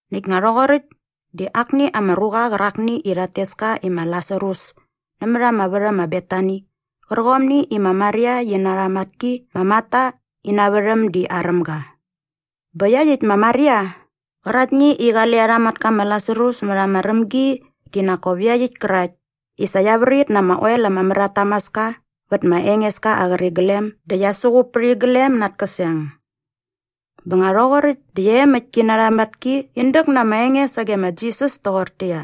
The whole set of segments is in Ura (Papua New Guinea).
Näkt nga rhoqoräkt di akni ama ruqa qärakni i rhat tes ka i ma Lasarus nämät ama värhäm ma Betani qärqomni i ma Maria qi na arha matki ma Marta ina värhäm di aräm ga. Bä iaqyäkt ma Maria qäraktni i qale arha matka ma Lasarus mät ama rämgi di nak kop iaqyäkt kärakt i sa qia vrit na ama oel ama mär at tamaska vät ma Engeska aa qäriglem dä qia suqup pät iglem na at käseng. Bä nga rhoqoräkt dä iaemäkt ki na arha matki in däk na ama enge sage ma Jisas toqortäqyia,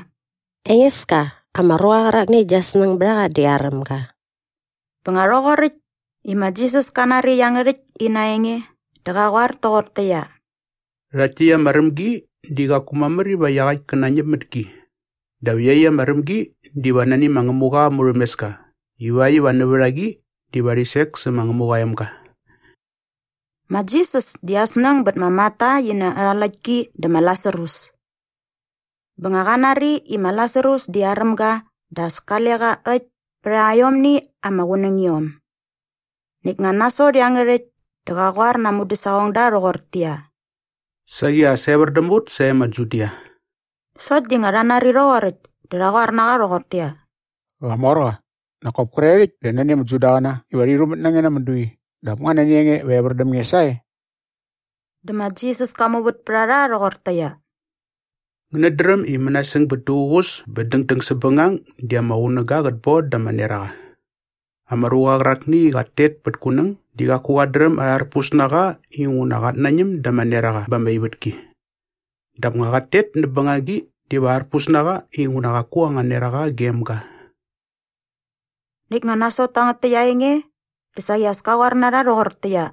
“Engeska, ama ruqa qärakni i gia snäng bät a qa di aräm ga.” Bä nga rhoqoräkt i ma Jisas ka nari iangärhäkt ina enge dä qa qoar toqortäqyia, “Rhakt täkt ama rämgi di qaku mamär iva iaqäkt kä nañäp mät ki. Dap iaqyäkt ama rämgi diva nani ma Ngämuqa aa murhämeska ivakt iva nävät a qi diva rhi sek sä ma Ngämuqa aa emga.” Ma Jisas di aa snäng bät ma Marta qi na arha läktki dä ma Lasarus. Bä nga qa nari i ma Lasarus di aräm ga dä as kale qa äkt pät aiomni ama qunängiom. Näkt nga nasot iangärhäkt dä qa qoar na aa mudäsaqongda rhoqortäqyia, “Saqi as evär däm ut sae ma Judia.” Sokt di nga rha nari rhoqoräkt dä rha qoar na qa rhoqortäqyia, “Qamorqa, nak kop kre rhäkt di nani ama Judaqäna iva rhi rhumät na nge na ama dui dap nga nani a nge iva evär däm nge sae?” Dä ma Jisas ka muvät pät a rha rhoqortäqyia, “Ngänät dräm i mänasäng bät duququs bä dängdäng säpbängang di ama qunäga qät bon da ama neraqa. Ama ruqa qärakni i qat tet pät kunäng di qaku qat dräm arharpus na qa inguna qat nañäm da ama neraqa ba ama ivätki. Dap nga qat tet näp bängagi diva arpus na qa inguna qaku anga neraqa gem ga.” Näkt nga nasot tangät täkt aa enge dä saqi as ka qoar na rha rhoqortäqyia,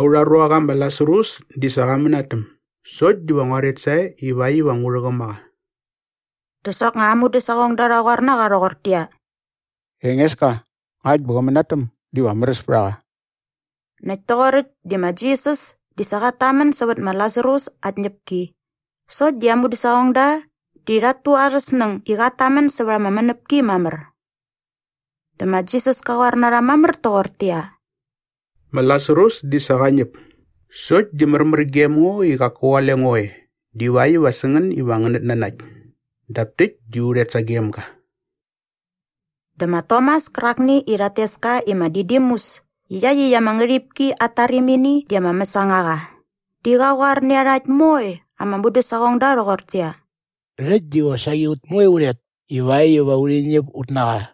“Aurha ruaqa ma Lasarus di sa qa mänatäm sokt diva ngua rhet sae ivakt iva ngu rhäqäm a qa.” Dä soknga aa mudäsaqongda rha qoar na qa rhoqortäqyia, “Engeska, ngakt bä qä mänatäm diva märäs pät a qa.” Näkt toqoräkt di ma Jisas di sa qat tamän sävät ma Lasarus aa tñäpki sokt di aa mudäsaqongda di rhat tu arhä snäng i qat tamän sävät ama mänäpki mamär. Dä ma Jisas ka qoar na rha mamär toqortäqyia, “Ma Lasarus di sa qa ñäp sokt di märmär gem ngo i qaku qale ngo e divakt iva sä ngän iva ngänät nanakt. Dap täkt di u rhet sagem ga.” Dä ma Tomas kärakni i rhat tes ka i ma Didimus i iaqyäkt ama ngärhipki at tarimini di ama mäsangaqa di qa qoar nä iarhakt moe ama mudäsaqongda rhoqortäqyia, “Rhäkt di qosaqi ut moe u rhet ivakt iva urhi ñäp ut na qa.”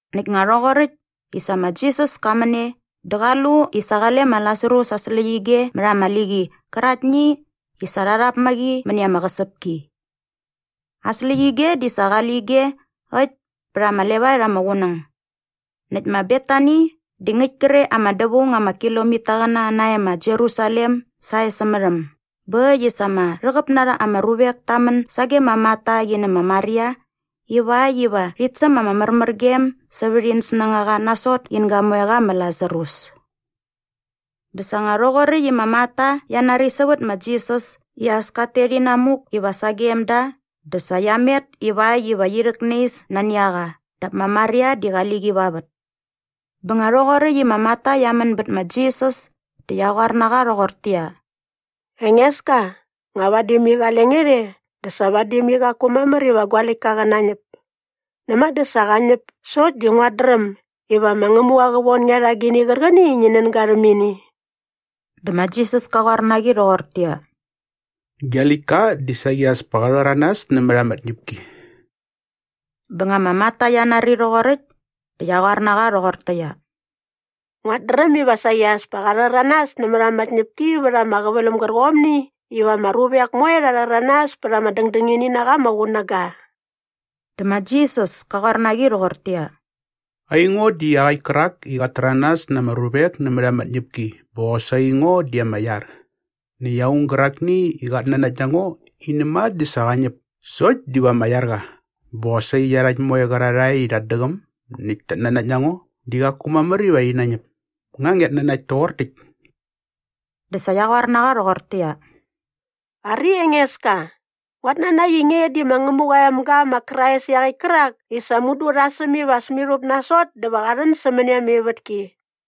Näkt nga rhoqoräkt i sa ma Jisas ka män e dä qa lu i sa qale ma Lasarus aa släqyige mät ama liqi qäraktni i sa rha rhap mä qi mäni ama qäsäpki. Aa släqyige di sa qale ige äkt pät ama levaet ama qunäng. Näkt ma Betani di ngäkt kre ama dävaung ama kilomitaqäna nae ma Jerusalem sae sämät äm bä äkt i sa ama rhäqäp na ama ruvek ta män sage ma Marta qi nä ma Maria ivakt iva rhit säm ama märmärgem sävät in snängaqa nasot in gamoeqa ma Lasarus. Bä sa nga rhoqoräkt i ma Marta qia nari sävät ma Jisas i as kat tet inamuk iva sagem da dä sa qia met ivakt iva qi rhäknais nani a qa dap ma Maria di qali qi va vät. Bä nga rhoqoräkt i ma Marta qia män bät ma Jisas dä qia qoar na qa rhoqortäqyia, “Engeska, nga vadi mai qale nge rhe dä sa vadi mai qaku mamär iva gua läktka qä nañäp. Näma dä sa qa ñäp sokt di nguat dräm iva ma Ngämuqa qä von nge rha agini qärqäni i ngi nän ga rhäm ini.” Dä ma Jisas ka qoar na qi rhoqortäqyia, “Gia läktka di saqi as pa qa rhäranas nämät ama tñäpki.” Bä nga ma Marta qia nari rhoqoräkt dä qia qoar na qa rhoqortäqyia, “Nguat dräm iva saqi as pa qa rhäranas nämät ama tñäpki vät ama qäväläm gärqomni iva ama ruvek moe rha rhäranas pät ama dängdängini na qa ama qunäga.” Dä ma Jisas ka qoar na qi rhoqortäqyia, “Aingo di iaqäkt kärak i qat täranas na ama ruvek nämät ama tñäpki bä qosaqi ngo di ama iar. Näkt aung gärakni i qat nanakt na ngo i näma dä sa qa ñäp sokt diva ama iar qa bä qosaqi iarhakt moe qärarhae i rhat däqäm näkt tat nanakt na ngo di qaku mamär iva rhi nañäp. Nga ngiat nanakt toqor täkt?” Dä sa qia qoar nä qa rhoqortäqyia, “Ari Engeska, nguat nanakt i nge di ma Ngämuqa aa emga ma Krais iaqäkt kärak i sa mudu rha säm iva as mirhup nasot dä va qa rhän sämäni ama ivätki.”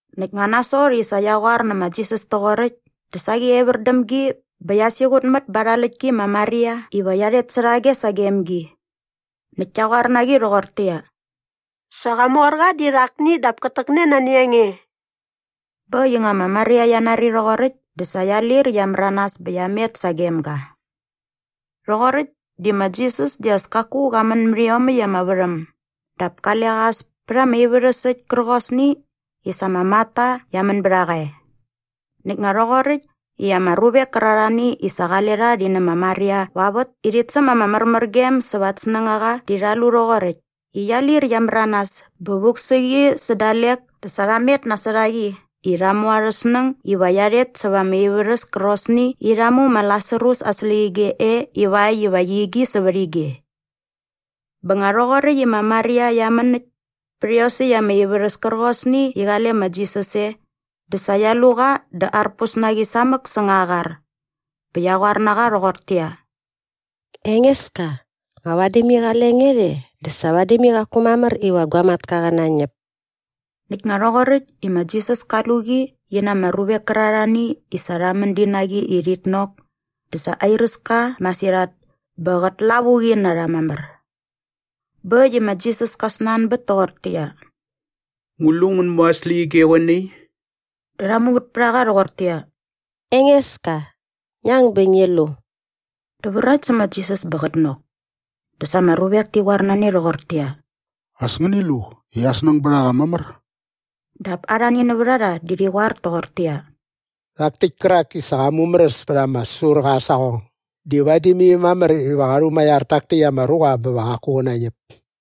Näkt nga nasot i sa qia qoar nä ma Jisas toqoräkt dä saqi evär däm gi bä qia siqutmät ba arha läktki ma Maria iva qia rhet särhage sagem gi. Näkt kia qoar na qi rhoqortäqyia, “Sa Qamorqa di rhakni dap kät täkne nani a nge.” Bä äkt i nga ma Maria qia nari rhoqoräkt dä sa qia lir qia märanas bä qia met sagem ga. Rhoqoräkt di ma Jisas di as kaku qa män mät iomäkt ama värhäm dap kale qa as pät ama ivärhäs äkt kärqosni i sa ma Marta qia män bät a qa e. Näkt nga rhoqoräkt i ama ruvek kärarhani i sa qale rha rhi nä ma Maria va vät i rhit säm ama märmärgem sävät at snängaqa di rha lu rhoqoräkt i qia lir qia märanas bä vuk sä qi sä dalek dä sa rha met nasot a qi i rha mu arhä snäng iva qia rhet sävät ama ivärhäs kärqosni i rha mu ma Lasarus aa släqyige e ivakt iva qi igi sävät ige. Bä nga rhoqoräkt i ma Maria qia män äkt pät iosäkt ama ivärhäs kärqosni i qale ma Jisas e dä sa qia lu qa dä arpus na qi samäk säng aa qar bä qia qoar na qa rhoqortäqyia, “Engeska, nga vadi mai qale nge rhe dä sa vadi mai qaku mamär iva gua matka qä nañäp.” Näkt nga rhoqoräkt i ma Jisas ka lu qi i qi na ama ruvek kärarhani i sa rha män di na qi i rhit nok dä sa airäs ka masirhat bä qät lavuqi na rha mamär. Bä äkt i ma Jisas ka snanbät toqortäqyia, “Ngu lu ngän mu aa släqyige qoe nai?” Dä rha muvät pät a qa rhoqortäqyia, “Engeska, ngi ang bä ngi lu.” Dä vrakt sä ma Jisas bä qät nok. Dä sa ama ruvek ti qoar na ne rhoqortäqyia, “As ngäni lu i aa snäng bät a qa mamär!” Dap arhani nävät a rha di rhi qoar toqortäqyia, “Rhak täkt kärak i sa qa mumäräs pät ama säsurqa aa saqong di vadi mai mamär iva qa rhumaiar tak täkt ama ruqa bä va qaku qä nañäp.”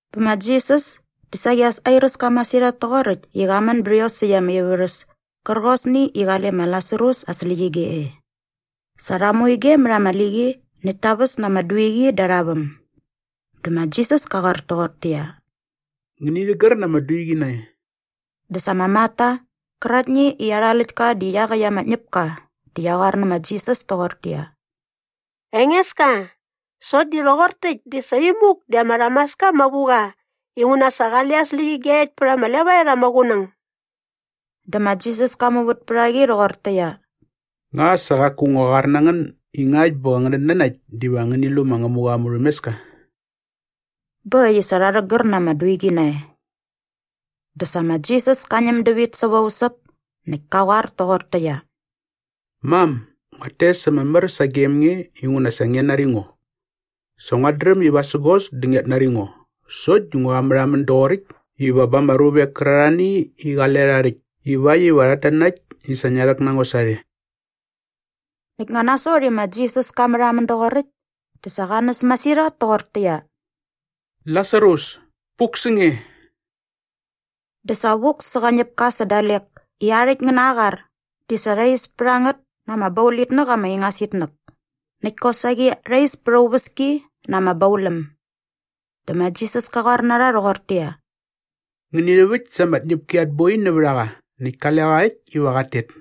Bä ma Jisas di saqi as airäs ka masirhat toqoräkt i qa män bät iosäkt ama ivärhäs kärqosni i qale ma Lasarus aa släqyige e. Sa rha mu ige mät ama liqi näkt ta väs na ama duiqi da arha väm. Dä ma Jisas ka qoar toqortäqyia, “Ngäni rhägär na ama duiqi nae.” Dä sa ma Marta qäraktni i arha läktka di iaqäkt ama ñäpka di qia qoar nä ma Jisas toqortäqyia, “Engeska, sokt di rhoqor täkt di sa imuk di ama rhamaska ama vu qa inguna sa qale aa släqyige äkt pät ama levaet ama qunäng.” Dä ma Jisas ka muvät pät a qi rhoqortäqyia, “Nga sa qaku ngua qoar na ngän i ngakt bä ngänät nanakt diva ngäni lu ma Ngämuqa aa murhämeska?” Bä äkt i sa rha rhägär na ama duiqi nae. Dä sa ma Jisas ka ñäm dävit säva usäp näkt ka qoar toqortäqyia, “Mam, nguat tes ama mär sagem nge inguna sa ngia nari ngo. Sa nguat dräm i vasägos dä ngiat nari ngo sokt di ngua märhamän doqoräkt iva ba ama ruvek kärarhani i qale rha rhäkt ivakt iva rhat nanakt i sa ngia rhäk na ngo sarhe.” Näkt nga nasot i ma Jisas ka märhamän doqoräkt dä sa qa näs masirhat toqortäqyia, “Lasarus, puk sä nge!” Dä sa vuk sä qa ñäpka sä dalek i aa rhäkt ngä na aa qar di sa rha is pät a ngät na ama baulitnäk ama ingas itnäk näkt kosaqi rha is pät aa uväski na ama bauläm. Dä ma Jisas ka qoar na rha rhoqortäqyia, “Ngäni rhäväkt sa ama tñäpki at boi nävät a qa näkt kale qa äkt iva qat tet.”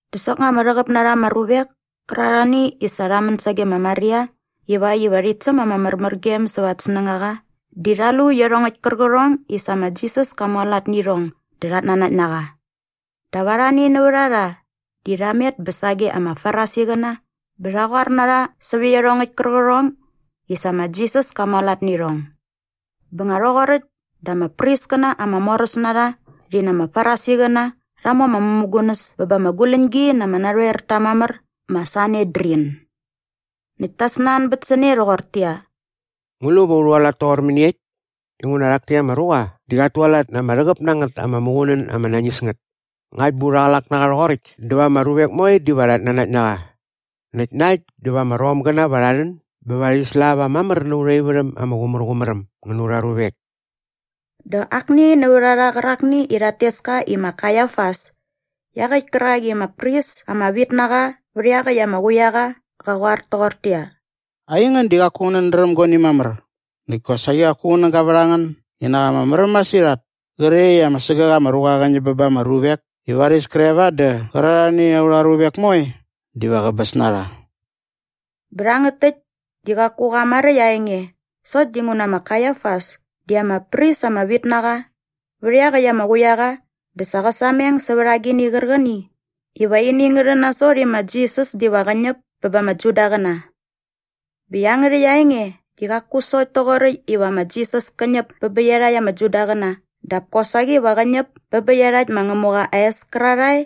Dä soknga ama rhäqäp na ama ruvek kärarhani i sa rha män sage ma Maria ivakt iva rhit säm ama märmärgem sävät at snängaqa di rha lu iarhongäkt kärqärhong i sa ma Jisas ka mualat nä irhong dä rhat nanakt na qa. Dap arhani nävät a rha di rha met bä sage ama Farisiqäna bä rha qoar na rha sävät iarhongäkt kärqärhong i sa ma Jisas ka mualat nä irhong. Bä nga rhoqoräkt dä ama priskäna ama moräs na rha rhi na ama Farisiqäna rha mu ama mämugunäs bä ba ama guläñgi na ama narhoerta mamär ma Sanedrin. Näkt ta snanbät sä ne rhoqortäqyia, “Ngu lu va u rhualat toqor mäniekt? Inguna rhak täkt ama ruqa di qat tualat na ama rhäqäp na ngät ama muqunän ama nañis ngät. Ngakt bä urha qlak na qa rhoqoräkt dä va ama ruvek moe diva rhat nanakt na qa. Näkt na äkt dä va ama Romgäna va rha rhän bä rhi slava mamär na aurha ivärhäm ama qumärqumär äm ngä na aurha ruvek.” Dä akni nävät a rha qärakni i rhat tes ka i ma Kaiafas iaqäkt kärak i ama pris ama vit na qa vät iaqäkt ama quiaqa qa qoar toqortäqyia, “Aingän di qaku ngänät dräm guani mamär! Näkt kosaqi qaku qunäga vät a ngän i nak ama märäm masirhat kre i ama sägäk ama ruqa qä ñäp bä ba ama ruvek i varis kre va dä qärarhani aurha ruvek moe diva qäbäs na rha.” Bä rhangät täkt di qaku qa maräkt aa enge sokt dinguna ma Kaiafas di ama pris ama vit na qa vät iaqäkt ama quiaqa dä sa qä sameng sävät agini qärqäni iva ini ngä rhän nasot i ma Jisas diva qä ñäp bä ba ama Judaqäna. Bä iangärhäkt aa enge di qaku sokt toqoräkt iva ma Jisas kä ñäp bä bä iarhakt ama Judaqäna dap kosaqi va qä ñäp bä bä iarhakt ma Ngämuqa aa es kärarhae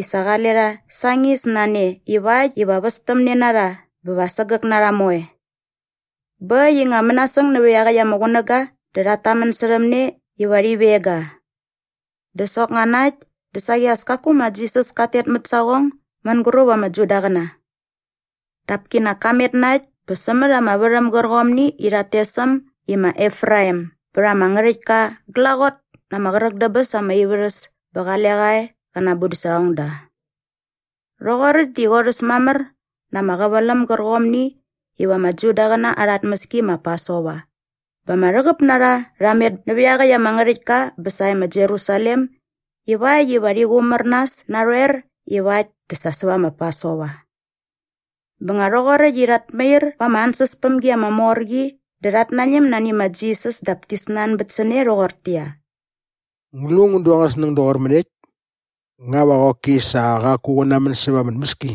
i sa qale rha sañis na ne ivakt iva qä västämne na rha bä va sägäk na rha moe. Bä äkt i nga mänasäng nävät iaqäkt ama qunäga dä rhat tamän särhäm ne iva rhi veng ga. Dä soknga na äkt dä saqi as kaku ma Jisas kat tet mät saqong mänguräp ama Judaqäna. Dap kinak ka met na äkt bä sämät ama värhäm gärqomni i rhat tes äm i ma Efraim bät ama ngärhäktka glaqot na ama qräk dä bäs ama ivärhäs bä qale qa e qä na aa mudäsaqongda. Rhoqoräkt di qorhäs mamär na ama qäväläm gärqomni iva ama Judaqäna arha tmäski ma Pasova bä ama rhäqäp na rha rha met nävät iaqäkt ama ngärhäktka bä sae ma Jerusalem ivakt iva rhi qumär nas narhoer iva äkt dä sa va ma Pasova. Bä nga rhoqoräkt i rhat mair va ama ansäspämgi ama mor qi dä rhat nañäm nani ma Jisas dap ti snanbät sä ne rhoqortäqyia, “Ngu lu ngän du angän snäng doqor mäniekt? Nga va qoki sa qaku qä namän säva ama tmäski?”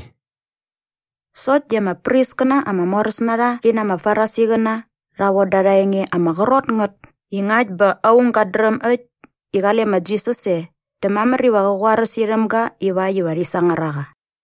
Sokt di ama priskäna ama moräs na rha rhi na ama Farisiqäna rha von da arha enge ama qrot ngät i ngakt bä aung gat dräm äkt i qale ma Jisas e dä mamär iva qä qoaräs irhäm ga ivakt iva rhi sangar a qa.